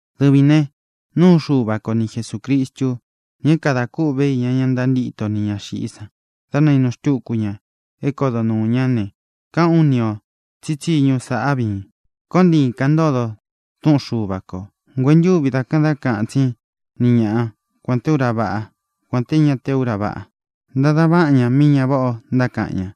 Dɨvīn ne, núu Xuva ko ni Jesūcristu, ña é kadā kûꞌvé iña ña ntantíto nī ña xiꞌí san dá nainu xtúku ña é kodo nuū ñá ne, káꞌān ú ni ō tsí tsiñu sāꞌá viin: Koon ntiīn kaꞌan ntódōn túꞌun Xuva kō. Nguentúvī da kaꞌan dá kaꞌan tsín ni ñaꞌa, kuān té ura váꞌa, kuān té ña té ura váꞌa. Ntadan váꞌan ñā mí ña váꞌa ō ntákaꞌan ña.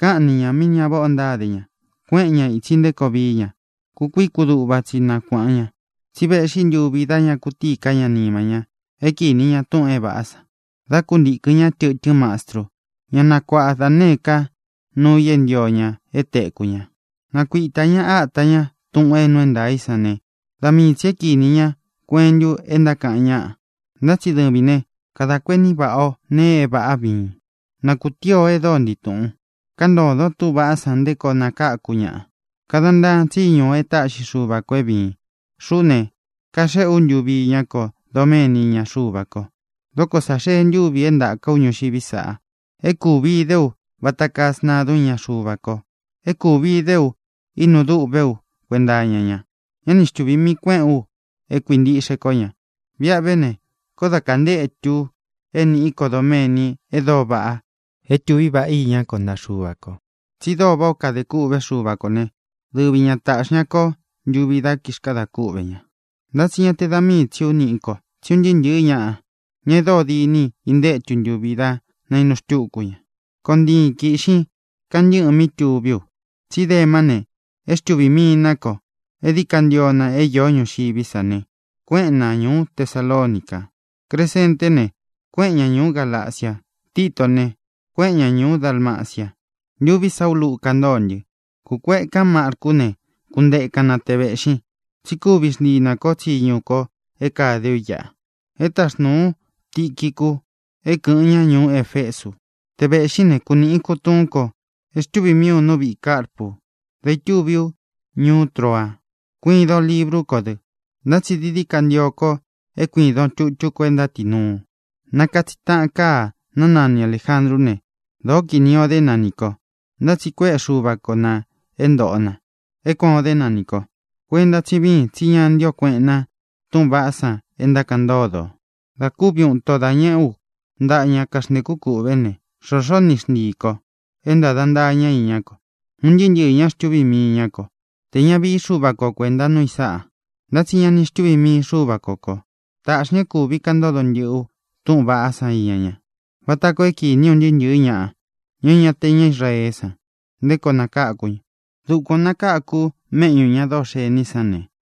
Káꞌan ni ñā mí ña váꞌa ō ntáde ña. Kuéꞌen ñā itsi nté koo vií ña. Kukuií kuduꞌva tsi nakuāꞌan ña. Tsi véꞌxi ntuvi dá ña kutíi ká ña nima ña é kinī ña túꞌūn é vāꞌá san. Dá kuntīkɨn ñá tɨtɨ́n mastru, ñá nakuaꞌa da nēé ka nuu i é ntio ña é tēkú ña. Nakuitā ñá ata ña túꞌūn é nuu é ntaā í san ne, da mii tsī é kīni ña kuentu e ntákaꞌan ñáꞌa. Ntá tsi dɨvīn né, kadā kuení vaꞌā ó nēe é vāꞌá viin. Na kūtíi o e dóo ntii tūꞌun. Káꞌan ntōdon túꞌūn vaꞌá san nté koo nakáku ñaꞌa. Kadan ntaan tsíñu o e táꞌxi Xuva kō é vīin. Xuꞌú ne, kaxéꞌē ú ntuvi iñá ko doméni iña Xuva ko. Dóko sā xee ntúvi é ntāka ú ñuxiví sa. É kūvi idé u vata kaa sntadun íña Xuva ko; é kūvi idé u ínu duꞌvé u kuenta iña ña; ñá ni xtuvī mii kuéꞌen ú e kuíntiꞌxe kó ña. Viꞌa ve ne, koó da kantétu u é nīꞌí ko doméni e dóo vaꞌa é tūví vaꞌa iñá ko ntaꞌa Xuva kō. Tsi dóo váꞌā ó kadē kûꞌvé Xuva kō né, dɨvi ña tāꞌxi ña kó ntuvi dá kixkadā kúꞌvē ña. Ntá tsi ña te da míi tsī ú niꞌí ko, tsí un ntɨɨ́ ntɨ̄ɨ́ ñaꞌa, ña e dóo diní i ntantétu ntuvi dá nainu xtúku ña. Koon ntiin kīꞌxin kantɨ́ꞌɨn mí tuví u. Tsí Demá ne, é xtuvī mii ná ko. E díi ka ntio na é īó ñuxiví sa ne, kuéꞌen na ñūú Tesalonica. Cresenté ne, kuéꞌen ña ñūú Galacia. Titó ne, kuéꞌen ña ñūú Dalmacia. Ntuví sa ú Luca ntóo ntɨ. Kūkuekán Marcú ne, kuntekan na te vēꞌxin, tsí kuvi xntii nā kó tsiñu ko é kāde ú iꞌa. E táxnūu ú Tiquicu é kɨ̄ꞌɨn ña ñuú Efesu. Te vēꞌxín ne, kunīꞌin kutuún ko e xtúvi mií u nú viꞌī Carpu dá ītúvi ú ñuú Troa. Kuidon librú ko dɨ; ntá tsi dií dií ka ntio ko é kuīdon tutú ko e ntátinuu. Ná katsiꞌi taꞌan káa, ná nani Alējandrú ne, dōó kinī o dé na nī ko. Ntá tsi kuéꞌe Xuva ko nā é ntōꞌo na é kuān o dé na nī ko. Kuenta tsí viín, tsi ña ntío kueꞌen na túꞌūn vaꞌá san e ntákaꞌan ntódo ō. Da kúvi uun īto dá ñēꞌé u ntaꞌa ña kaxntēkú kūꞌvé ne, xōxó ni xntii ī ko é ntāda ntaa ñá iñá ko. Un ntɨɨ́ ntɨɨ̄ ña xtúvī mii ñá ko. Tē ña vií Xuva ko kuēnta núu i sáꞌa. Ntá tsi ña ni xtuví mii Xuvā kó ko. Tāꞌxi ña é kūvi kaꞌan ntódo ntɨ́ꞌɨ ú túꞌūn vaꞌá san iña ña, vata koo é kīni un ntɨɨ́ ntɨ̄ɨ́ ñaꞌa, ña é ña te ña Israeé san, nté koo nakáku ña. Dukuān o nakáku u méꞌñū ña dóo xení i san ne,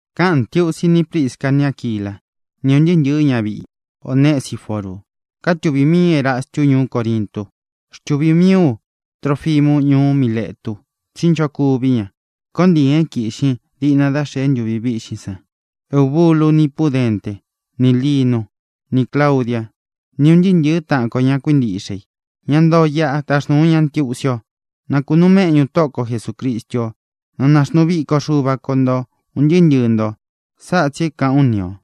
Káꞌān ntiusi ní Prisca ni Áquilá, ni ūn ntɨɨ́ ntɨ̄ɨ́ ñaviꞌi Onesiforu. Kátūvi mií Erastu ñuú Corintu. Xtuvī mií u Trofimu ñuú Miletu, tsí nchokuví ña. Koon ntīin é kīꞌxin diꞌna dá xēe ntúvi vīꞌxín san. Eubulu ni Púdenté, nī Linú, nī Claudiá, ni ūn ntɨɨ́ ntɨ̄ɨ́ taꞌan ko ña kuíntiꞌxe i, ña ntoo iꞌa, taxnūu ña ntiusi o. Na kūnuu méꞌñu Tóꞌo ko Jesūcristu ó; na naxnuu viko Xuva ko nto ūn ntɨɨ́ ntɨɨ̄ nto. Sáꞌa tsī é kāꞌán u ni ō.